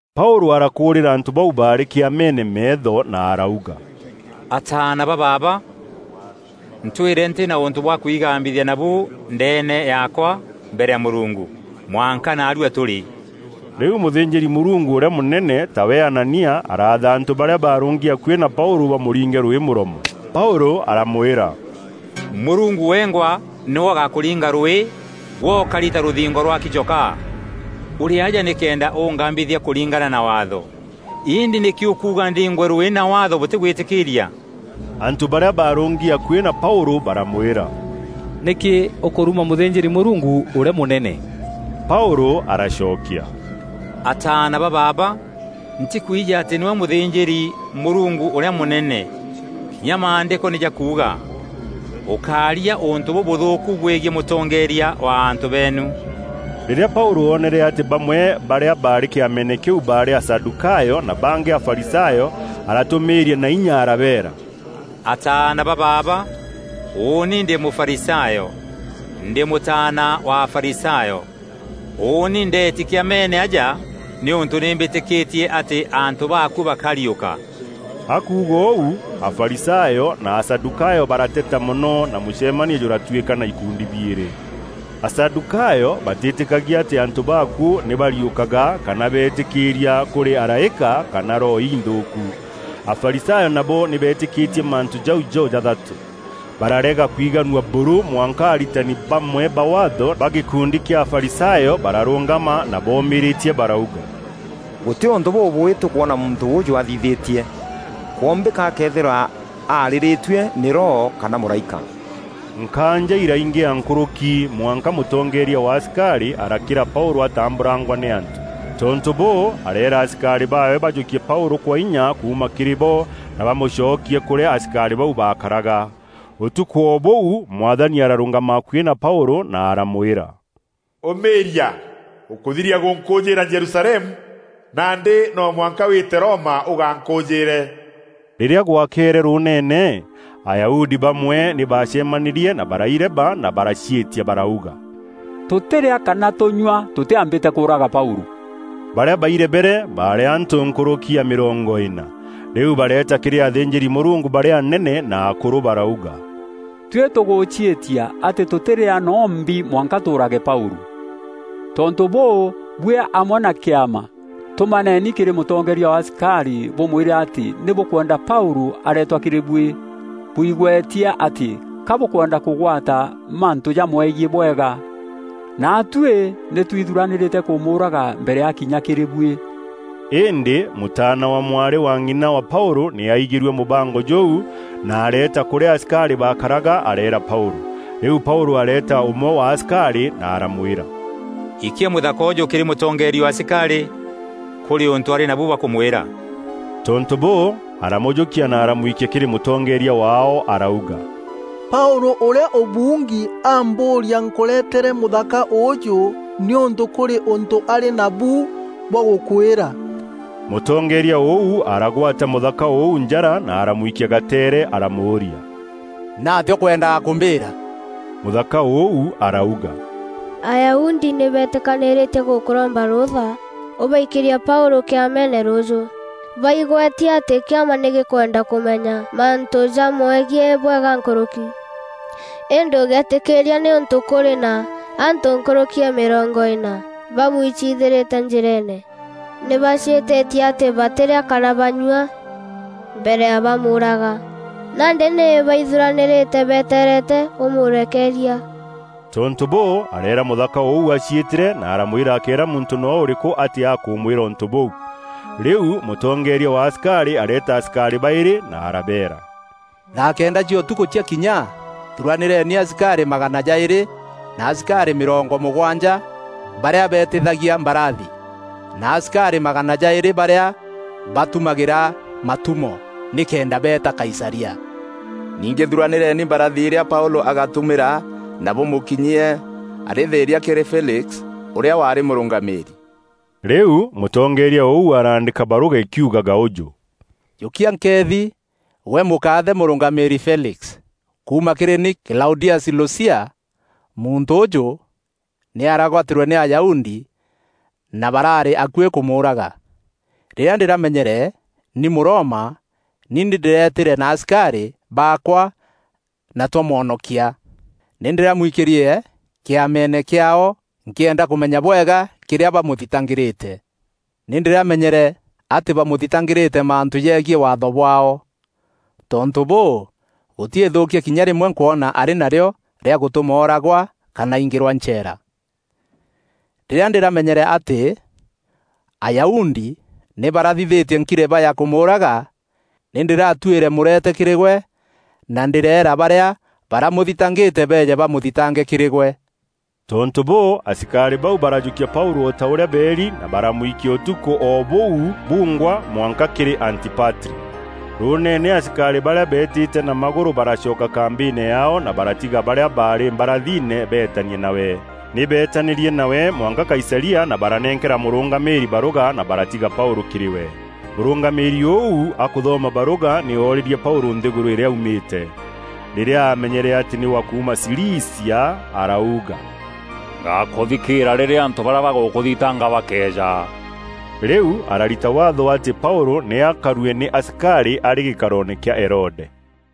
Paûlû arakûûrîra antû bau baarî Kîameene meetho na arauga, “Ataana ba baaba, ntwîre ntî na ûntû bwa kwigambithia nabû ndeene yaakwa, mbere ya Mûrungu, mwanka naarua tûrî.” Rîu mûthînjîri-Mûrungu ûrîa mûnene, tawe Anania, araatha antû barîa baarûngi akuî na Paûlû bamûringe rwîî mûromo. Paûlû aramwîra, “Mûrungu wengwa nîwe ûgakûringa rwîî, gwe ûkari ta rûthingo rwaki chokaa. Ûrî aja nîkenda ûngambithia kûringana na Waatho, îndî nîkî ûkuuga ndiingwe rwîî na Waatho bûtîgwîtîkîîria?” Antû barîa baarûngi akuî na Paûlû baramwîra, “Nîkî ûkûruma mûthînjîri-Mûrungu ûrîa mûnene?” Paûlû aracokia, “Ataana ba baaba, ntîkwijî atî nîwe mûthînjîri-Mûrungu ûrîa mûnene. Kinya Maandîko nî jakuuga, ‘Ûkária ûntû bûbûthûûku bwegiî mûtongeeria wa antû beenu.’” Rîrîa Paûlû oonere atî bamwe barîa baarî Kîameene kîu baarî Asadûkayo na bangî Afarisayo, aratûmîîria na inya arabeera: “Ataana ba baaba, ûûni ndî Mûfarisayo, ndî mûtaana wa Afarisayo. Ûûni ndeeti Kîameene aja nîûntû nî mbîtîkîtie atî antû baakuû bakariûka.” Akuuga ûu, Afarisayo na Asadûkayo barateta mono na mûcemanio jûratwîkana ikundi biîrî. Asadûkayo batîtîkagia atî antû baakuû nî bariûkaga kana beetîkia kûrî araîka, kana roho inthûûku. Afarisayo nabo nî beetîkîtie mantû jau jo-jathatû. Bararega kwiganua buru mwanka aritani bamwe ba Waatho, ba gîkundi kîa Afarisayo bararûngama na boomîrîtie barauga, “Gûtî ûntû bûbûûî tûkwona muntû ûûjû athithîtie. Kwombîka akeethîrwa aarîrîtue nî Roho kana mûraîka.” Nkaanja îraingîa nkûrûki mwanka mûtongeeria wa asikarî arakîra Paûlû atambûrangwa nî antû. Tontû bûû, areera asikarî baawe bajûkie Paûlû kwa inya kuuma kîrî bo, na bamûcokie kûrîa asikarî bau baakaraga. Ûtukû o bûu, Mwathani ararûngama akuî na Paûlû na aramwîra, “Ûmîîria! Ûkûthiria gûnkûûjîîra Jerusalemu, nandî no mwanka wîte Roma ûgankûûjîîre.” Rîrîa gwakeere rûûneene, Ayahudi bamwe nî baacemanîrie na baraireba na baraciîtia barauga: “Tûtîrîa kana tûnyua tûtîambîte kûûraga Paûlû.” Barîa bairebere baarî antû nkûrûki ya mîrongo îna. Rîu bareeta kîrî athînjîri-Mûrungu barîa anene na akûrû barauga, “Tuî tûgûciîtia atî tûtîrîa no mbi mwanka tûûrage Paûlû. Tontû bûû, buî amwe na Kîama, tûmaneeni kîrî mûtongeeria wa asikarî bûmwîre atî nî bûkwenda Paûlû areetwa kîrî buî, bwigwetie atî ka bûkwenda kûgwata mantû jamwegiî bwega. Naatuî nî twithuranîrîte kûmûûraga mbere ya akinya kîrî buî.” Îndî mûtaana wa mwarî wa ng'ina wa Paûlû nî aaigîrue mûbango jûu na areeta kûrîa asikarî baakaraga areera Paûlû. Rîu Paûlû areeta ûmwe wa asikarî na aramwîra, “Ikia mûthaka ûûjû kîrî mûtongeeria wa asikarî; kûrî ûntû arî nabu bwa kûmwîra.” Tontû bûû, aramûjûkia na aramwikia kîrî mûtongeeria waao arauga, “Paûlû, ûrîa ûbuungi, ambûûria nkûretere mûthaka ûûjû nîûntû kûrî ûntû arî nabu bwa gûkwîra.” Mûtongeeria ûu aragwata mûthaka ûu njara na aramwikia gateere aramûûria, “Nîatîa ûkwendaga kûmbîîra?” Mûthaka ûu arauga, “Ayahudi nî betîkanîîrîtie gûkûromba rûûtha ûbaikîrie Paûlû Kîameene rûûjû, baigwetie atî Kîama nî gîkwenda kûmenya mantû jamwegiî bwega nkûrûki. Îndî ûgéetîkîîria nîûntû kûrî na antû nkûrûki ya mîrongo îna bamwiciithîrîte njîreene. Nî baciîtîtie atî batîrîa kana banyua mbere ya bamûûraga. Nandî nî baithuranîrîte betereete ûmûrekeeria.” Tontû bûû, areera mûthaka ûu aciîtîre na aramwîra akéera muntû noo ûrîkû atî akûmwîra ûntû bûu. Rîu mûtongeeria wa asikarî areeta asikarî baîrî na arabeera, “Thaa kenda cia ûtukû ciakinya, thuranîreni asikarî magana jaîrî, na asikarî mîrongo mûgwanja barîa beetithagia mbarathi, na asikarî magana jaîrî barîa batumagîra matumo, nîkenda beeta Kaisaria. Ningî thuranîreni mbarathi irîa Paûlû agatûmîra na bûmûkinyie arî thîîria kîrî Felix ûrîa waarî mûrûngamîîri.” Rîu mûtongeeria ûu araandîka barûga îkiugaga ûjû: Jûkia nkeethi gwe mûkaathe mûrûngamîîri Felix, kuuma kîrî ni Klaudiasi Lusia, Muntû ûûjû nî aragwatîrwe nî Ayahudi na baraarî akuî kûmûûraga. Rîrîa ndîramenyere nî Mûroma nî ndîretîre na asikarî baakwa na twamwonokia. Nî ndîramwikîrie Kîameene kîaao nkîenda kûmenya bwega kîrîa bamûthitangîrîte. Nî ndîramenyere atî bamûthitangîrîte mantû jegiî Waatho bwaao. Tontû bûû, gûtî îthûûkia kinya rîmwe nkwona arî narîo rîa gûtûma ooragwa kana aingîrwa ncheera. Rîrîa ndîramenyere atî Ayahudi nî barathithîtie nkireba ya kûmûûraga, nî ndîratuîre mûrete kîrî gwe na ndîreera barîa baramûthitangîte beeje bamûthintange kîrî gwe. Tontû bûû, asikarî bau barajûkia Paûlû o ta ûrîa beeri na baramwikia ûtukû o bûu bungwa mwanka kîrî Antipatri. Rûûneene asikarî barîa beetîte na magûrû baracoka kambîîne yaao na baratiga barîa baarî mbarathine beetanie nawe. Nî beetanîrie nawe mwanka Kaisaria na baranenkera mûrûngamîîri barûga na baratiga Paûlû kîrî we. Mûrûngamîîri ûu akûthoma barûga, nî oorîrie Paûlû nthîgûrû îrîa aumîte. Rîrîa aamenyere atî nî wa kuuma Cilicia, arauga, “Ngakûthikîîra rîrîa barîa bagûkûthitanga bakeeja.” Rîu ararita waatho atî Paûlû nî akarue nî asikarî arî gîkaroone kîa Herode.